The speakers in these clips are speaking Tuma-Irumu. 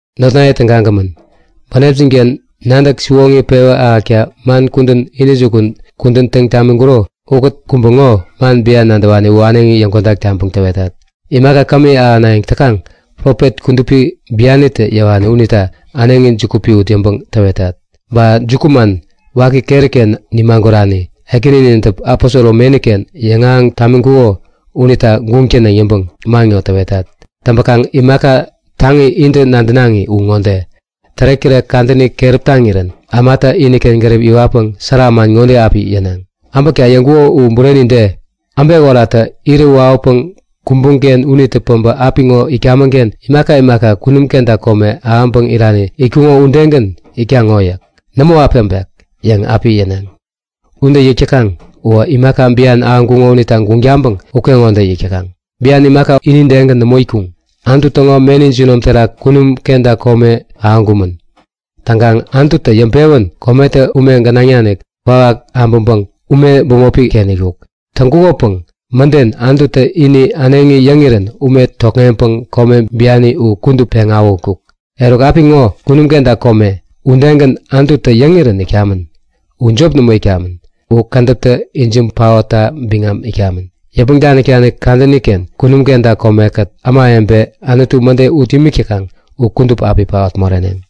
Notnaye tägagämän, bänepjin-ken nadäk siwoŋi pewä ahäkta man kudän intäjukun kudän täŋ tamiŋkuro ukät kubä ŋo man bian nadäwani u äneŋi yäŋkodak taŋpäŋ täwetat. Imaka kämi ahänayäŋ täkaŋ profet kudupi bianitä yäwani unita äneŋi juku piwut yäŋpäŋ täwetat. Ba jukuman waki keri-ken nimagurani Ekäninintä aposoro meni-ken yäŋahäŋ tamiŋkuko unita guŋ täneŋ yäŋpäŋ man ŋo täwetat. Täŋpäkaŋ imaka taŋi intä nadänaŋi u ŋode; Tärektärek kadäni keräp taŋirän ämatä iniken gärip iwatpäŋ sära man ŋode api yäneŋ; Äbäkta yäŋkuko u bureni de? Äbek oratä irä wawäpäŋ kumbuŋ-ken unitä päbä apiŋo itkamäŋ-ken imaka imaka kunum kenta kome ahäŋpäŋ irirän itkuŋo udegän itkaŋ ŋo yäk. Nämo api äbek! yäŋ api yäneŋ. Ude yäk täkaŋ uwä imaka bian ahäŋkuŋo unita guŋ taŋpäŋ ukeŋode yäŋ yäk täkaŋ. Upäŋkaŋ bian imaka inidegän nämo itkuŋ. Anutu täŋo meni jinom terak kunum kenta kome ahäŋkumän. Täŋkaŋ Anututä yäŋpewän kometä ume gänaŋ nanik kwawak abäŋpäŋ ume bämopi-ken itkuk. Täŋkukopäŋ mäden Anututä ini äneŋi yäŋirän ume tokŋeŋpäŋ kome biani u kudup peŋ awähutkuk. Eruk apiŋo kunum kenta kome udegän Anututä yäŋirän itkamän. U jop nämo itkamän, u kädäptä ijiŋ paotta biŋam itkamän. Yäpmäŋ danik-danik kadäni-ken kunum kenta kome-kät ämawebe Anututa mäde ut imik täkaŋ u kudup api paot moreneŋ.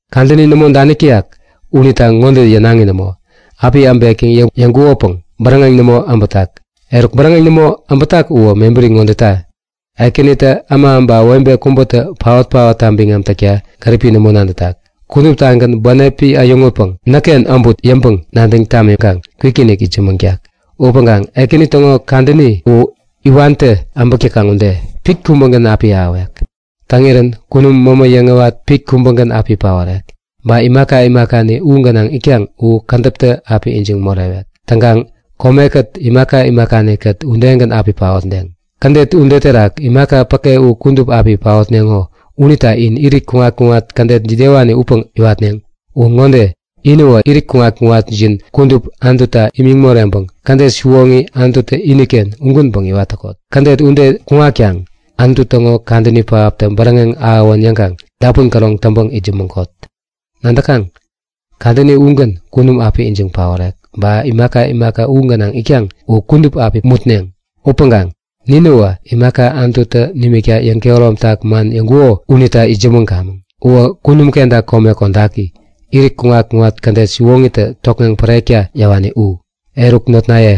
Kadäni nämo danik täyak unita ŋode yänaŋi nämo; Api äbek yäŋ yäŋkukopäŋ bäräŋeŋ nämo äbätak. Eruk bäräŋeŋ nämo äbätak uwä mebäri ŋodeta; Ekänitä äma ba webe kubätä paot-paotta biŋam täkta gäripi nämo nadätak. Kuduptagän bänepi äyäŋutpäŋ näkken äbut yäŋpäŋ nadäŋ tamiŋkaŋ kwikinik itsämäŋtak. Upäŋkaŋ Ekäni täŋo Kadäni u, iwantä äbäk täkaŋ ude, pit kubägän api ahäwek. Täŋirän kunum mämä yäŋäwat pit kubägän api paorek. Ba imaka imakani u gänaŋ itkaŋ u kädäptä api ijiŋ morewek. Täŋkaŋ kome ini ba imaka imakani u terak itkaŋ u kudup udegän api paotneŋ. Kädet ude terak imaka päke u kudup api paotneŋo unita in irit kuŋat-kuŋat kädet jidewani upäŋ iwatneŋ? Uwä ŋode; Inäwä irit kuŋat-kuŋatjin kudup Anututa imiŋ moreŋpäŋ kädet siwoŋi, Anututä iniken ugänpäŋ iwat täkot. Kädet ude kuŋatkaŋ Anutu täŋo kadäni pähaptä bäräŋeŋ ahäwän yäŋkaŋ dapun käroŋ täŋpäŋ itsämäŋkot. Nadäkaŋ, kadäni ugän kunum api ijiŋ paorek ba imaka imaka kunum terak itkaŋ u kudup api mutneŋ. Upäŋkaŋ ninäwä imaka Anututä nimikta yäŋkehäromtak man yäŋkuko unita itsämäŋkamäŋ. Uwä kunum kenta kome kodaki, irit kuŋat-kuŋat kädet siwoŋitä tokŋeŋ pärekta yäwani u. Eruk notnaye,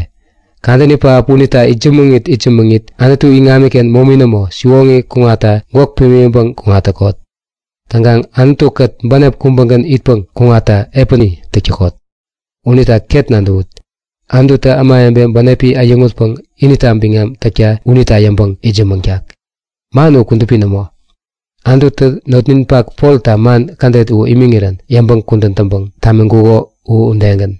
kadäni pähap unita itsämäŋit itsämäŋit Anutu iŋamiken momi nämo, siwoŋi kuŋatta gwäk pimiŋpäŋ kuŋat täkot. Täŋkaŋ Anutu-kät bänep kubägän itpäŋ kuŋatta epäni täk täkot. Unita ket nadäwut; Anututä ämawebe bänepi äyäŋutpäŋ inita biŋam täkta unita yäŋpäŋ itsämäŋtak. Man u kudupi nämo. Anututä notninpak Polta man kädet u imiŋirän yäŋpäŋ kudän täŋpäŋ tamiŋkuko u udegän.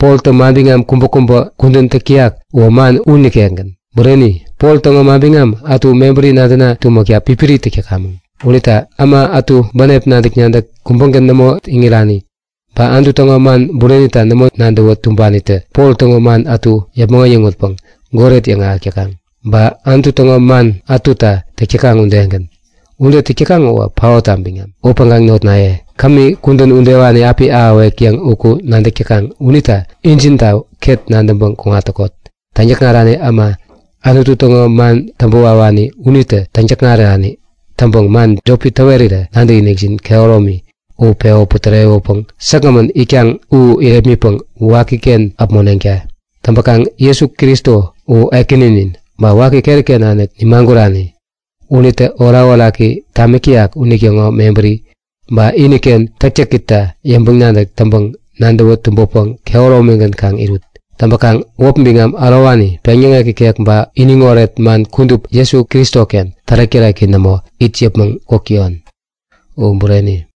Poltä manbiŋam kubäkubä kudän täk täyak uwä man u nikekgän. Bureni, Pol täŋo manbiŋam ätu mebäri nadäna tumäkta pipiri täk täkamäŋ. Unita äma ätu bänep nadäk-nadäk kubägän nämo iŋirani, ba Anutu täŋo man burenita nämo nadäwä tumbanitä Pol täŋo man ätu yäpmäŋ äyäŋutpäŋ goret yäŋahäk täkaŋ, ba Anutu täŋo man ätuta täk täkaŋ udegän. Ude täk täkaŋ uwä paotta biŋam. Upäŋkaŋ notnaye, kudän udewani kämi api ahäwek yäŋ uku nadäk täkaŋ unita injinta ket nadäŋpäŋ kuŋat täkot. Täŋyäkŋarani äma, Anutu täŋo man täŋpäwawani unitä täŋ-täkŋarani täŋpäŋ man jopi täwerirä nadäkinikjin kehäromi u pewä putärewäpäŋ säkgämän itkaŋ u irepmitpäŋ wakiken äpmoneŋta! Täŋpäkaŋ Jesu Kristo u Ekäninin ba waki keri-ken nanik nimagurani. Unitä orakoraki tamik täyak unitäŋo mebäri, ba iniken täktäkita yäŋpäŋ-nadäk täŋpäŋ nadäwä tumbäpäŋ kehäromigän kaŋ irut. Täŋpäkaŋ wäp biŋam ärowani, peŋyäŋek ikek ba iniŋoret man kudup Jesu Kristoken tärek-täreki nämo it yäpmäŋ kuk täyon. U bureni!